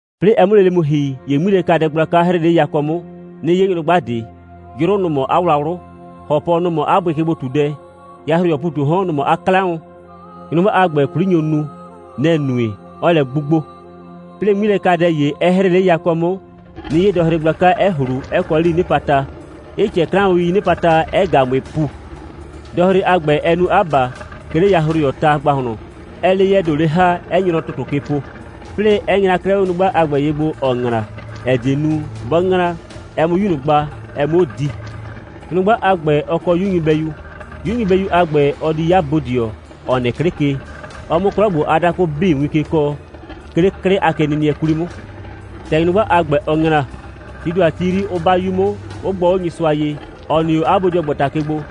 'Plɩɩ ɛ 'mʋ lele mu ‑hi, ‑ye 'ŋmilɛkadɛ gblaka 'hrɩɩ 'le yakɔ 'mʋ, 'nɩ 'ye nyrʋgba ꞊de. 'Yrʋ, nʋ‑ mɔ 'a wlawlʋ, ‑hɔpɔ, nɔ‑ mɔ 'a bʋɩkegbo꞊tudɛ. Yahroyɔɔ ‑pu ꞊tu 'o 'hɔn, nɔ‑ mɔ 'a 'klaʋn. Nyrʋgba a ‑gbɛ, 'kwli nyo nu. Nɛ‑ nue, 'ɔɔ lɛ 'gbugbo. 'Plɩɩ, 'ŋmilɛkadɛ ‑ye, 'ɛ 'hrɩɩ 'le yakɔ 'mʋ, 'nɩ 'ye dɔhre gblaka, 'ɛ ꞊hlu, 'ɛ kɔ 'lii 'nɩpata, 'ɩ ꞊cɛɛ 'klaʋn.ii 'nɩpata, 'ɛ ꞊ga ꞊mʋɩɩ ‑pu; dɔhre a ‑gbɛ 'ɛ nu 'a ‑ba, 'ke 'le yahroyɔɔ ta ‑gbahlɔn, 'ɛɛ 'le 'yɛɛ ‑do 'le ‑ha, 'ɛ nye nɔ ‑tʋtʋ ke po, 'plɩɩ 'ɛ nyra 'klɛɛ 'o nyrʋgba a ‑gbɛ ye gbo, ‑ɔɔ ‑ŋla, ‑ɛ die nu, 'bɔ ‑ŋla, ɛ 'mʋ 'yu ꞊nʋ gba, ɛ 'muo di. Nyrʋgba a ‑gbɛ, ɔ kɔ 'yu nyɩbɛyu. 'Yu nyɩbɛyu a ‑gbɛ, ɔ di 'ya bodɩɔ, ‑ɔ nɩ 'klɩ ke, ɔ 'mʋ 'klɔ ‑gbo a dakʋ 'bii win ke kɔɔ, 'ke 'le 'klɩ a kenɩnɩɛ 'kwli 'mʋ. ‑Tɛ nyrʋgba a ‑gbɛ, ɔ ‑ŋla, tii ‑do a ti 'yri, 'ʋ 'ba 'yu 'mʋ, 'ʋ gbɔ 'o Nyɩsʋa ye, ‑ɔ nɩ 'o 'a bodɩɔgbata ke gbo,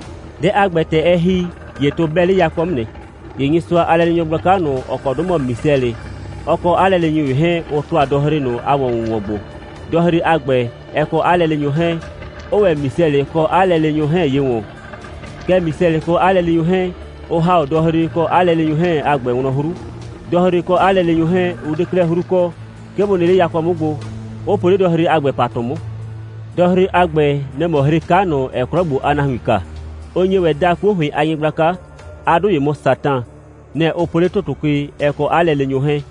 Dɛ a ‑gbɛ, ‑tɛ ɛ ‑hi, ‑ye tʋ 'bɛ 'le yakɔ 'mʋ nɩ. ‑Ye Nyɩsʋa a lɛleenyɔ gblaka ꞊nʋ, ‑ɔ kɔ 'dʋ mɔ Misɛlɩ, ɔ kɔ 'a lɛleenyʋ ‑ye 'hɛɛn, ʋ ‑tʋa dɔhre ꞊nʋ a ‑wɔn‑wʋnwɔn gbo, dɔhre a ‑gbɛ, ɛ kɔ 'a lɛleenyʋ 'hɛɛn, 'ʋʋ ‑wɛ Misɛlɩ kɔ 'a lɛleenyʋ 'hɛɛn ye ‑wɔn. Kɛɛ, Misɛlɩ kɔ 'a lɛleenyʋ 'hɛɛn, ʋ ‑ha 'o dɔhre kɔ 'a lɛleenyʋ 'hɛɛn a ‑gbɛ wlɔn 'hru. Dɔhre kɔ 'a lɛleenyʋ 'hɛɛn, ʋ 'de 'klɛɛ 'hru kɔ, 'ke bʋ nɩ 'le yakɔ 'mʋ gbo, 'ʋ po 'le dɔhre a ‑gbɛ ‑patʋ 'mʋ. Dɔhre a ‑gbɛ, nɛ‑ mɔ hre 'ka ꞊nʋ, ‑ɛɛ 'klɔ ‑gbo a nahuin kaa. Ʋ nye ‑wɛ daa 'kuo ‑hʋɩn a nyɩgblaka. 'A 'dʋ ‑ye mɔ Satan. Nɛ‑ ʋ po 'le ‑tʋtʋ ke, ɛ kɔ 'a lɛleenyʋ 'hɛɛn.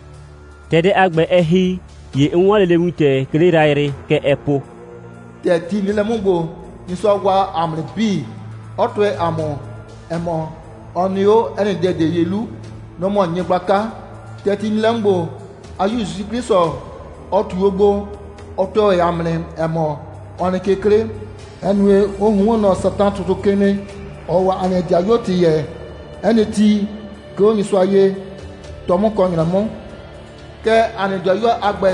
‑Tɛ dɛ a ‑gbɛ, ɛ ‑hi, ‑ye 'n 'wɔn lele wintɛ, 'ke 'le yrayrɩ. Kɛ ɛɛ po: «‑Tɛ ti nɩ lɛ 'mʋ ‑gbo, Nyɩsʋa waa ‑a mʋ nɩ 'bii, 'ɔ tʋɛ ‑a mʋ, ‑ɛ mɔ, ɔ nɩ 'o 'ɛ nɩ dɛ ꞊de ye 'lu. Nɔ‑ mɔ nyɩgblaka. ‑Tɛ ti nɩ lɛ 'mʋ ‑gbo, 'a 'Yu ‑Yusu 'Klɩsʋ, ɔ ꞊tu 'o gbo, ɔ tʋɛ ‑wɛ ‑a mʋ nɩ, ‑ɛ mɔ, ɔ nɩ ke 'klɩ, ‑ɛ nue, ʋ ꞊hunhuon nɔ Satan ꞊nʋ ‑tʋtʋ ke nɩ, ‑ɔɔ o ‑a nɩ 'dɩayuo ‑tɩ yɛɛ, 'ɛ nɩ ti, 'ke 'o Nyɩsʋa ye, 'tɔ 'mʋ kɔ ‑nyrɛ 'mʋ. Kɛɛ, ‑a nɩ 'dɩayuo a ‑gbɛ,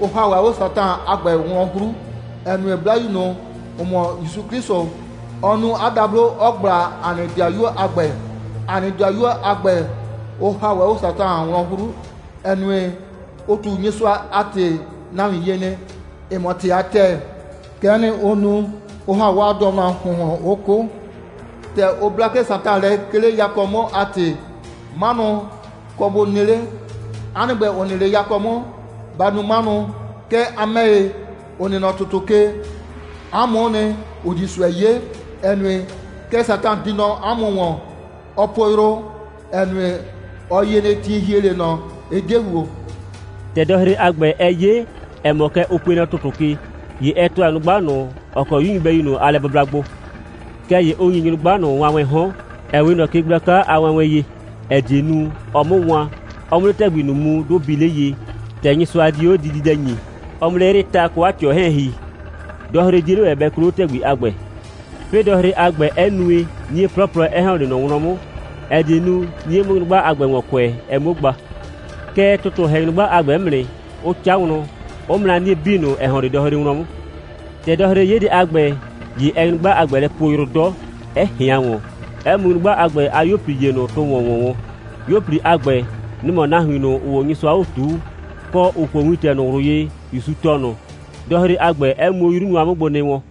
ʋ ‑ha ‑wɛ 'o Satan a ‑gbɛ wlɔn 'hru, ‑ɛ nue, 'Blayu ꞊nʋ, ‑ʋ mɔ ‑Yusu 'Klɩsʋ, ɔ nu 'a dablo, 'ɔ ꞊gbla ‑a nɩ 'dɩayuo a ‑gbɛ. ‑A nɩ 'dɩayuo a ‑gbɛ, ʋ ‑ha ‑wɛ 'o Satan wlɔn 'hru, ‑ɛ nue, ʋ ꞊tu Nyɩsʋa a ‑tɩ nahuin ye nɩ, ‑ɩ mɔ ‑tɩ a ‑tɛɛ. Kɛ'ɛ nɩ, ʋ nu, 'ʋ ‑ha 'waa dɩɔnʋ a ‑hʋnhlʋn, 'ʋ 'kʋ. ‑Tɛ ʋ bla 'klɛɛ Satan lɛ, 'ke 'le yakɔ 'mʋ a ‑tɩ, 'manʋ kɔ bʋ nɩ 'le. 'A nɩ ‑gbɛ, ‑ʋ nɩ 'le yakɔ 'mʋ, ba nu 'manʋ. Kɛɛ, a ‑mɛ ‑ye, ‑ʋ nɩ nɔ ‑tʋtʋ ke, 'a mʋ'ʋ nɩ, ‑ʋ di ꞊sʋɛ 'ye, ‑ɛ nue, kɛ Satan di nɔ 'a mʋ ‑wɔn. Ɔɔ po yrʋ, ‑ɛ nue, ɔ yie nɩ, ti ‑hie 'le ꞊nɔ, ɩ 'de ‑huo.» ‑Tɛ dɔhre a ‑gbɛ, ɛ 'ye, ‑ɛ mɔ, kɛ ʋ pue nɔ ‑tʋtʋ ke, ‑ye ɛ ‑tʋa nyrʋgba ꞊nʋ, ‑ɔ kɔ 'yu nyɩbɛyu ꞊nʋ a lɛbʋbla gbo. Kɛɛ ‑ye ʋ ‑nyi nyrʋgba ꞊nʋ wanwɛɛn 'hɔn, ‑ɛ 'we ꞊nɔ ke gblaka a wanwɛn ye, ‑ɛ die nu, ɔ 'mʋ wan, ɔ 'mʋ 'le ‑tɛgbi ꞊nʋ mu, 'dʋ bii 'le ye, ‑tɛ Nyɩsʋa dio 'o dididɛ ‑nyii, ɔ 'mʋ 'le 'yrɩɩ ta kɔ 'a ꞊tɩɔ 'hɛɛn ‑hi. Dɔhre 'die 'le ‑wɛ bɛ kloo 'o ‑tɛgbi a ‑gbɛ. 'Plɩɩ, dɔhre a ‑gbɛ, 'ɛ nue, 'nie 'plɔplɔ 'ɛ ‑hɔn 'le ꞊nɔ wlɔn 'mʋ, ‑ɛ die nu, 'nie 'mʋ nyrʋgba a ‑gbɛ ‑wɔn kʋɛ, ɛ 'muo gba. Kɛɛ, ‑tʋtʋ ‑hɛ nyrʋgba a ‑gbɛ 'mʋ nɩ, 'ʋ 'ca wlɔn, 'ʋ mra 'nie 'bii ꞊nʋ, ‑ɛ ‑hɔn 'le dɔhre wlɔn 'mʋ. ‑Tɛ dɔhre 'ye dɛ a ‑gbɛ, ‑ye ɛɛ nyrʋgba a ‑gbɛ lɛ poo yrʋ 'dɔ, 'ɛ ꞊hɩan ‑wɔn, 'ɛ mu nyrʋgba a ‑gbɛ a 'yuo꞊pli ‑ye ꞊nʋ tʋ ‑wɔn ‑wɔn wɔn. 'Yuo꞊pli a ‑gbɛ, nʋ‑ mɔ nahuin ꞊nʋ, ‑ʋʋ 'o Nyɩsʋa 'o ꞊tuu, kɔ, ‑ʋ kuo wintɛ ꞊nʋ ꞊wlʋ ye, ‑Yusu tɔɔ ꞊nʋ; dɔhre a ‑gbɛ 'ɛ mu 'o 'yru nʋa 'mʋ gbo nɩ wɔn.